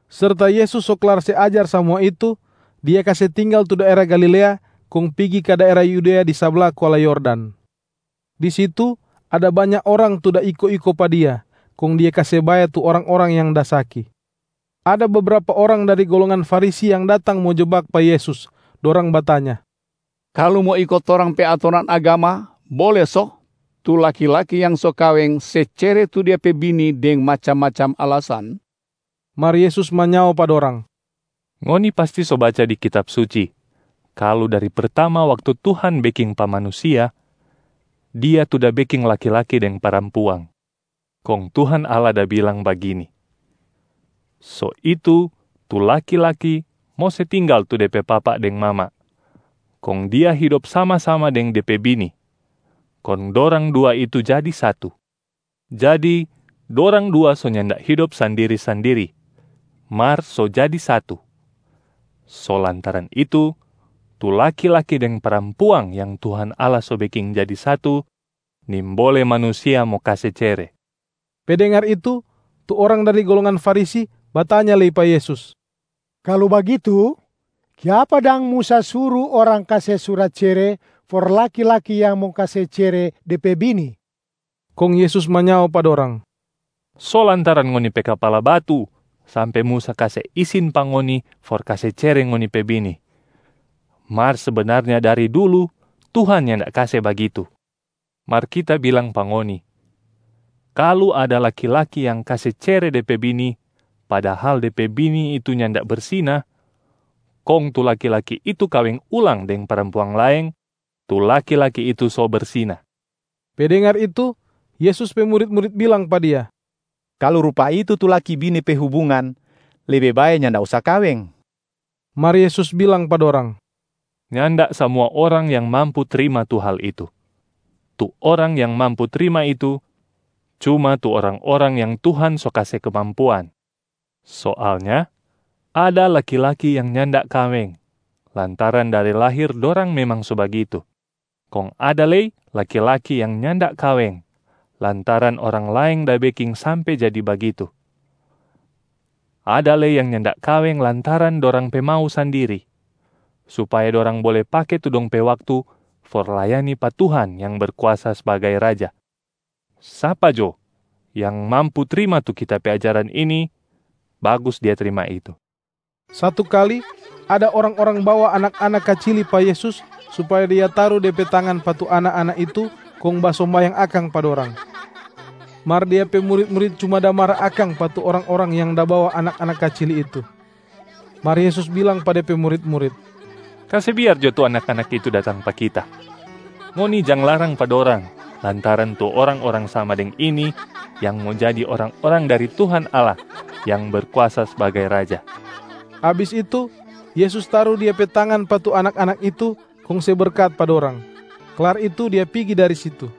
Serta Yesus so klar se ajar samua itu, Dia kase tinggal tu daera Galilea kong pigi ka daera Yudea di sabla kuala Yordan. Di situ ada banya orang tu da iko-iko pa Dia, kong Dia kase bae tu orang-orang yang da saki. Ada bebrapa orang dari golongan Farisi yang datang mo jebak pa Yesus, dorang batanya, “Kalu mo iko torang pe atoran agama, bole so tu laki-laki yang so kaweng se cere tu dia pe bini deng macam-macam alasan?” Mar Yesus manyao pa dorang, “Ngoni pasti so baca di Kitab Suci kalu dari pertama waktu Tuhan beking pa manusia, Dia tu da beking laki-laki deng parampuang. Kong Tuhan Allah da bilang bagini, ‘So itu, tu laki-laki mo se tinggal tu de pe papa deng mama, kong dia hidop sama-sama deng de pe bini, kong dorang dua itu jadi satu.’ Jadi dorang dua so nyanda hidop sandiri-sandiri, mar so jadi satu. So lantaran itu, tu laki-laki deng parampuang yang Tuhan Allah so beking jadi satu, nimbole manusia mo kase cere.” Pe dengar itu, tu orang dari golongan Farisi batanya lei pa Yesus, “Kalu bagitu, kiapa dang Musa suru orang kase surat cere for laki-laki yang mo kase cere de pe bini?” Kong Yesus manyao pa dorang, “So lantaran ngoni pe kapala batu sampe Musa kase isin pa ngoni for kase cere ngoni pe bini, mar sebenarnya dari dulu Tuhan nyanda kase bagitu. Mar Kita bilang pa ngoni, kalu ada laki-laki yang kase cere de pe bini padahal de pe bini itu nyanda bersina, kong tu laki-laki itu kaweng ulang deng parampuang laeng, tu laki-laki itu so bersina.” Pe dengar itu, Yesus pe murit-murit bilang pa Dia, “Kalu rupa itu tu laki-bini pe hubungan, lebe bae nyanda usa kaweng.” Mar Yesus bilang pa dorang, “Nyanda samua orang yang mampu trima tu hal itu. Tu orang yang mampu trima itu, cuma tu orang-orang yang Tuhan so kase kemampuan. Soalnya ada laki-laki yang nyanda kaweng lantaran dari lahir dorang memang so bagitu, kong ada lei laki-laki yang nyanda kaweng lantaran orang laeng da beking sampe jadi bagitu. Ada lei yang nyanda kaweng lantaran dorang pe mau sandiri, supaya dorang bole pake tu dong pe waktu for layani pa Tuhan yang Berkuasa sbagai Raja. Sapa jo yang mampu trima tu Kita pe ajaran ini, bagus dia trima itu.” Satu kali ada orang-orang bawa anak-anak kacili pa Yesus supaya Dia taru De pe tangan pa tu anak-anak itu kong basombayang akang pa dorang. Mar Dia pe murit-murit cuma da mara akang pa tu orang-orang yang da bawa anak-anak kacili itu. Mar Yesus bilang pa De pe murit-murit, “Kase biar jo tu anak-anak itu datang pa Kita! Ngoni jang larang pa dorang lantaran tu orang-orang sama deng ini yang mo jadi orang-orang dari Tuhan Allah yang Berkuasa sbagai Raja.” Abis itu, Yesus taru Dia pe tangan pa tu anak-anak itu kong se berkat pa dorang. Klar itu Dia pigi dari situ.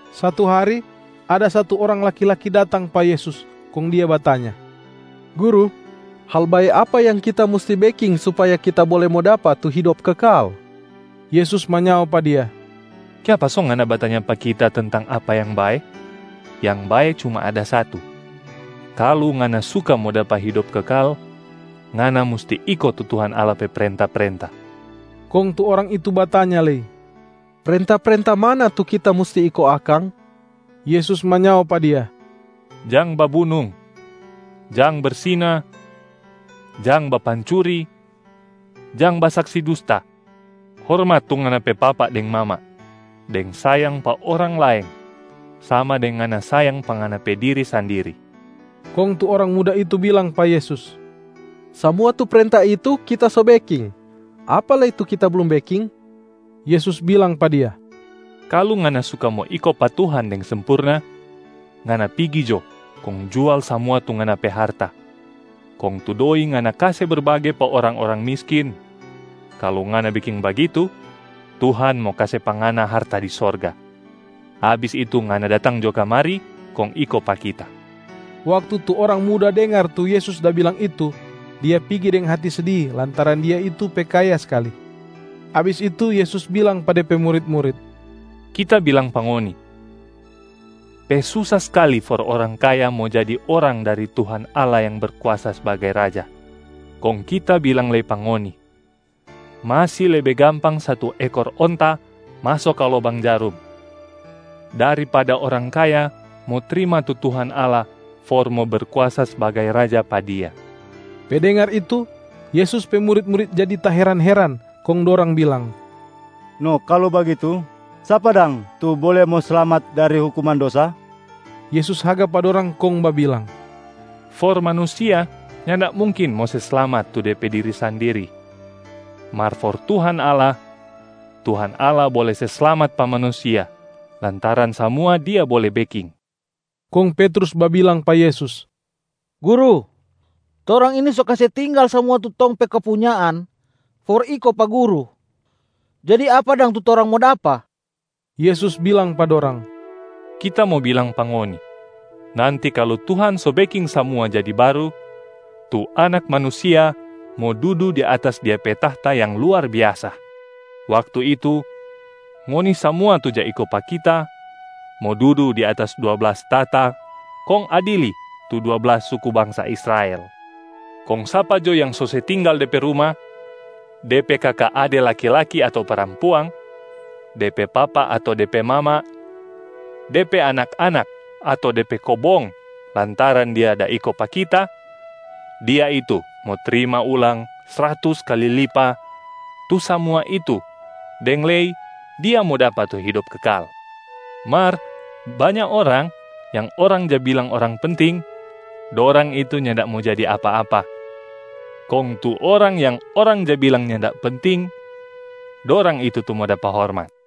Satu hari, ada satu orang laki-laki datang pa Yesus, kong dia batanya, “Guru, hal bae apa yang kita musti beking supaya kita bole mo dapa tu hidop kekal?” Yesus manyao pa dia, “Kiapa so ngana batanya pa Kita tentang apa yang bae? Yang bae cuma ada Satu. Kalu ngana suka mo dapa hidop kekal, ngana musti iko tu Tuhan Allah pe prenta-prenta.” Kong tu orang itu batanya lei, “Prenta-prenta mana tu kita musti iko akang?” Yesus manyao pa dia, “Jang babunung, jang bersina, jang bapancuri, jang basaksi dusta, hormat tu ngana pe papa deng mama, deng sayang pa orang laeng sama deng ngana sayang pa ngana pe diri sandiri.” Kong tu orang muda itu bilang pa Yesus, “Samua tu prenta itu kita so beking. Apa lei tu kita blum beking?” Yesus bilang pa dia, “Kalu ngana suka mo iko pa Tuhan deng sempurna, ngana pigi jo kong jual samua tu ngana pe harta, kong tu doi ngana kase berbage pa orang-orang miskin. Kalu ngana beking bagitu, Tuhan mo kase pa ngana harta di sorga. Abis itu ngana datang jo kamari kong iko pa Kita.” Waktu tu orang muda dengar tu Yesus da bilang itu, dia pigi deng hati sedi lantaran dia itu pe kaya skali. Abis itu Yesus bilang pa De pe murit-murit, “Kita bilang pa ngoni, pe susa skali for orang kaya mo jadi orang dari Tuhan Allah yang Berkuasa sbagai Raja. Kong Kita bilang lei pa ngoni, masi lebe gampang satu ekor onta maso ka lobang jarum, daripada orang kaya mo trima tu Tuhan Allah for mo Berkuasa sbagai Raja pa dia.” Pe dengar itu, Yesus pe murit-murit jadi taheran-heran, kong dorang bilang, “No kalu bagitu, sapa dang tu bole mo slamat dari hukuman dosa?” Yesus haga pa dorang kong babilang, “For manusia nyanda mungkin mo se slamat tu de pe diri sandiri, mar for Tuhan Allah, Tuhan Allah bole se slamat pa manusia lantaran samua Dia bole beking.” Kong Petrus babilang pa Yesus, “Guru, torang ini so kase tinggal samua tu tong pe kepunyaan for iko pa Guru. Jadi apa dang tu torang mo dapa?” Yesus bilang pa dorang, “Kita mo bilang pa ngoni, nanti kalu Tuhan so beking samua jadi baru, tu Anak Manusia mo dudu di atas Dia pe tahta yang luar biasa. Waktu itu, ngoni samua tu ja iko pa Kita mo dudu di atas dua blas tahta kong adili tu dua blas suku bangsa Israel. Kong sapa jo yang so se tinggal de pe ruma, de pe kaka ade laki-laki ato parampuang, de pe papa ato de pe mama, de pe anak-anak ato de pe kobong lantaran dia da iko pa Kita, dia itu mo trima ulang sratus kali lipa tu samua itu deng lei dia mo dapa tu hidop kekal. Mar banya orang yang orang ja bilang orang penting, dorang itu nyanda mo jadi apa-apa, kong tu orang yang orang ja bilang nyanda penting, dorang itu tu mo dapa hormat.”